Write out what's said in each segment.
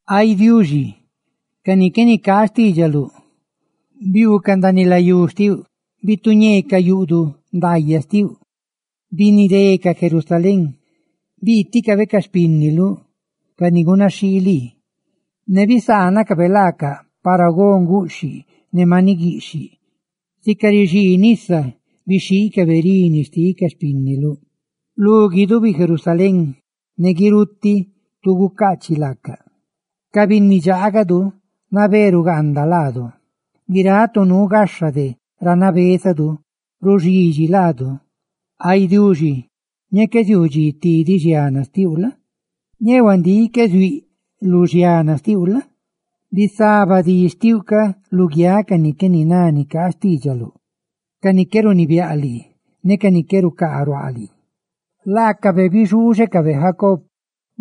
¡Ay Diuxi, ca ni qué nicaa xtiidxaluꞌ biuucaꞌ ndaaniꞌ layú xtiuꞌ! Bituñeecaꞌ yuꞌduꞌ ndaayaꞌ xtiuꞌ ne binidecaꞌ Jerusalén! ¡Biiticabe ca xpínniluꞌ, ca ni gunaxhii lii, ne bisaanacabe laacaꞌ para go nguꞌxhiꞌ ne maniꞌ guiꞌxhiꞌ laacaꞌ! Sica rixii nisa bixhiicabe rini xticaꞌ lu guidubi Jerusalén, ne guirutiꞌ tu gucaachiꞌ laacaꞌ. Ca binni dxaagadu nabé rugaanda laadu; guiráꞌ tu nuu gaxha de ra nabézadu ruxidxi laadu. Ay Tata Diuxi, ñee qué ziuu dxi tidiꞌ xiana xtiuꞌ la? Ñee huandíꞌ qué ziuíꞌ lu xiana xtiuꞌ la? ¡Bisaba di xtiuꞌ ca luguiáꞌ ca ni qué niná nicaa xtiidxaluꞌ ca ni qué runibiáꞌ lii ne ca ni qué rucaa ruaa lii! Laacabe bixuuxecabe Jacob,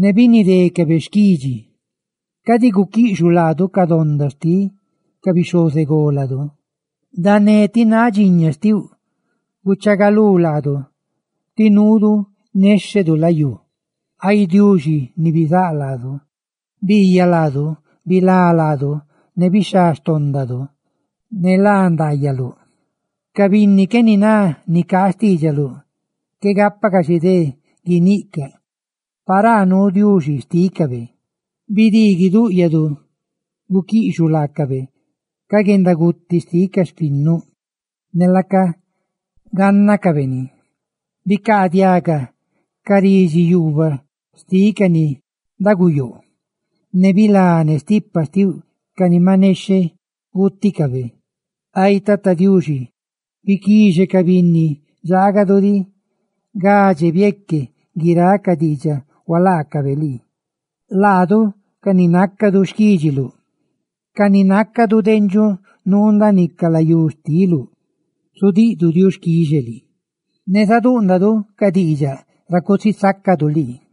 ne binidécabe xquidxi. Cadi guquiꞌxuꞌ laadu ca donda xtiꞌ ca bixhozególadu; ¡dané ti náꞌ dxiña xtiuꞌ guchaagalú laadu, tí nuudu néxhedu layú! ¡Ay Diuxi, ni rulá laadu, biiyaꞌ laadu, bilá laadu ne bixhá xtóndadu, ne lá ndaayaluꞌ! Ca binni qué niná nicaa xtiidxaluꞌ, qué gápacaꞌ xidé guiniꞌcaꞌ: «Paraa nuu Diuxi xtícabe.» ¡Bidii guidúꞌyadu guquiꞌxuꞌ laacabe ca guendaguti xtiꞌ ca xpinnuꞌ! ¡Ne laaca gánnacabe ni! Bicaadiaga ca ridxi yuubaꞌ xtiꞌ ca ni daguyoo, ne bilá ne stipa ndxoꞌ xtiuꞌ ca ni maꞌ nexheꞌ guuticabe. Ay Tata Diuxi, biquixe ca binni dxaagadu diꞌ gadxe bieque guiráꞌ ca diidxaꞌ hualaacabe lii; ne laadu, ca ni nácadu xquídxiluꞌ, ca ni nácadu dendxuꞌ nuu ndaaniꞌ ca layú xtiluꞌ, qué ziaanadxidu de gudiꞌduꞌ diuxquixe lii, ¡ne zadúꞌndadu ca diidxaꞌ ra cusisácadu lii!